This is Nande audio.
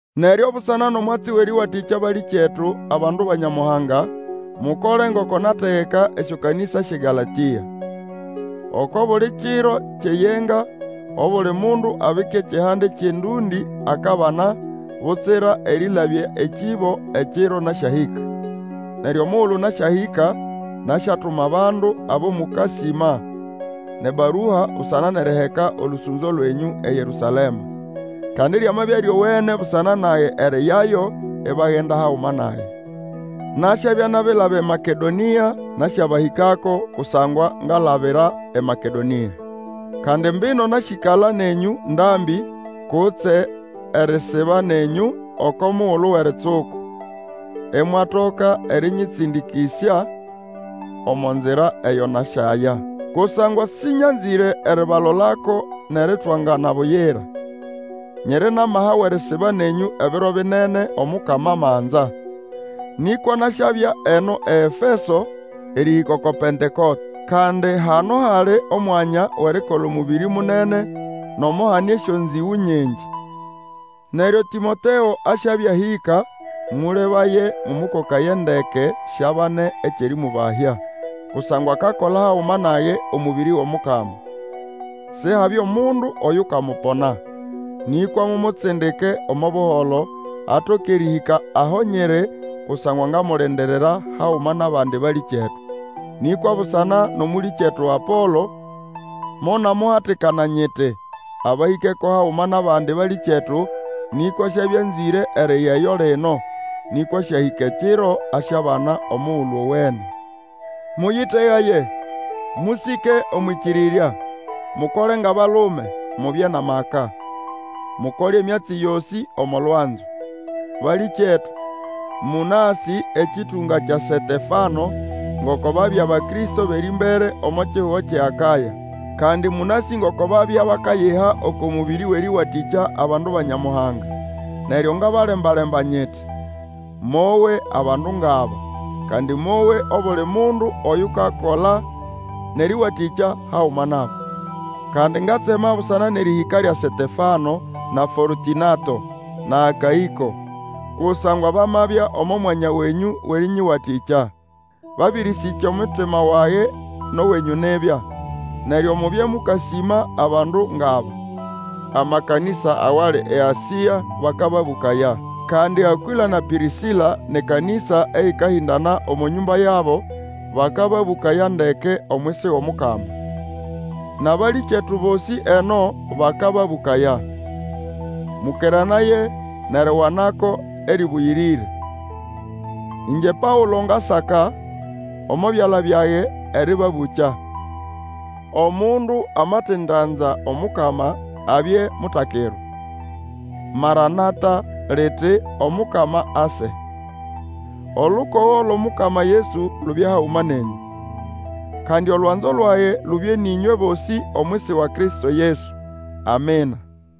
Neryo busana nʼomwatsi wʼerĩwatĩkya balĩkyetu abandu ba Nyamuhanga. Mukole ngoko nategeka esyokanĩsa syʼeGalatĩa. Oko buli kiro kyʼeyenga, obuli mundu abike ekihande kyʼendũndĩ akabana, butsira erĩlabya ekĩbo ekiro nasyahĩka. Neryo omugulu nasyahĩka, nasyatuma abandu abo mũkasĩma nʼebarua busana nʼeriheka olũsũnzo lwenyũ eYerũsalema. Kandi lyamabya lyowene busana nage eriyayo, ibagenda haguma nage. Nasyabya nabilaba eMakedonĩa nasyabahĩkako, kusangwa ngalabira eMakedonĩa. Kandi mbino nasyĩkala nenyũ ndambĩ, kutse erisiba nenyũ oko mugulu wʼeritsuku, imwatoka erĩnyĩtsĩndĩkĩsya omo nzira eyo nasyaya. Kusangwa sĩnyanzĩre eribalolako nʼeritwangana buyira. Nyiri nʼamaha wʼerisiba nenyũ ebiro binene, Omukama amanza. Nĩkwa nasyabya eno eEfeso erĩhĩka oko Pentekote. Kandi hano hali omwanya wʼerikola omũbĩrĩ munene, nomo hane esyonzĩgũ nyingi. Neryo Tĩmoteo asyabya ahĩka, mũlebaye mũmũkokaye ndeke siabane ekyʼerĩmũbahya. Kusangwa akakola haguma nage omũbĩrĩ wʼOmukama. Sihabye omundu oyukamupona. Nĩkwa mumutsindike omo buholo, atoke erĩhĩka aho nyiri, kusangwa ngamulindirira haguma nʼabandi balĩkyetu. Nĩkwa busana nʼomũlĩkyetu Apolo, monamuhatikana nyiti, abahĩkeko haguma nʼabandi balĩkyetu; nĩkwa siabya anzĩre eriyayo lino, nĩkwa asyahĩka ekiro asyabana omugulu owene. Mũyĩtegaye, mũsĩke omwʼĩkĩrĩrya, mukole ngʼabalume, mubye nʼamaka. Mukole emyatsi yosĩ omo lwanzo. Balĩkyetu, mũnasĩ, ekĩtũnga kya Setefano, ngoko babya Abakristo bʼerĩmbere omo kihugo kyʼeAkaya, kandi mũnasĩ ngoko babya bakayiha oko mũbĩrĩ wʼerĩwatĩkya abandu ba Nyamuhanga. Neryo ngabalemba-lemba nyiti, Mowe abandu ngʼaba, kandi mowe obuli mundu oyukakola nʼerĩwatĩkya haguma nabo. Kandi ngatsema busana nʼerĩhĩka lya Setefano na Fortũnato, na Akaĩko; kusangwa bamabya omo mwanya wenyũ wʼerĩnyĩwatĩkya. Babĩrĩsĩkya omutima wage nʼowenyũ nibya. Neryo mubye mũkasĩma abandu ngʼaba. Amakanĩsa awali eAsĩa bakababũkaya. Kandi Akwĩla na Pĩrĩsĩla nʼekanĩsa eyĩkahĩndana omo nyũmba yabo bakababũkaya ndeke, omwisi wʼOmukama, Nʼabalĩkyetu bosĩ eno bakababũkaya. Mũkeranaye nʼeriwanako erĩbũyĩrĩre. Ĩngye Paũlo ngasaka, omo byala byage erĩbabũkya. Omundu amatindanza Omukama, abye mutakirwa. Maranatha, liti, Omukama ase! Olukogo lwʼOmukama Yesu lubye haguma nenyũ. Kandi olwanzo lwage lubye nʼĩnywe bosĩ omwisi wa Kristo Yesu. Amina.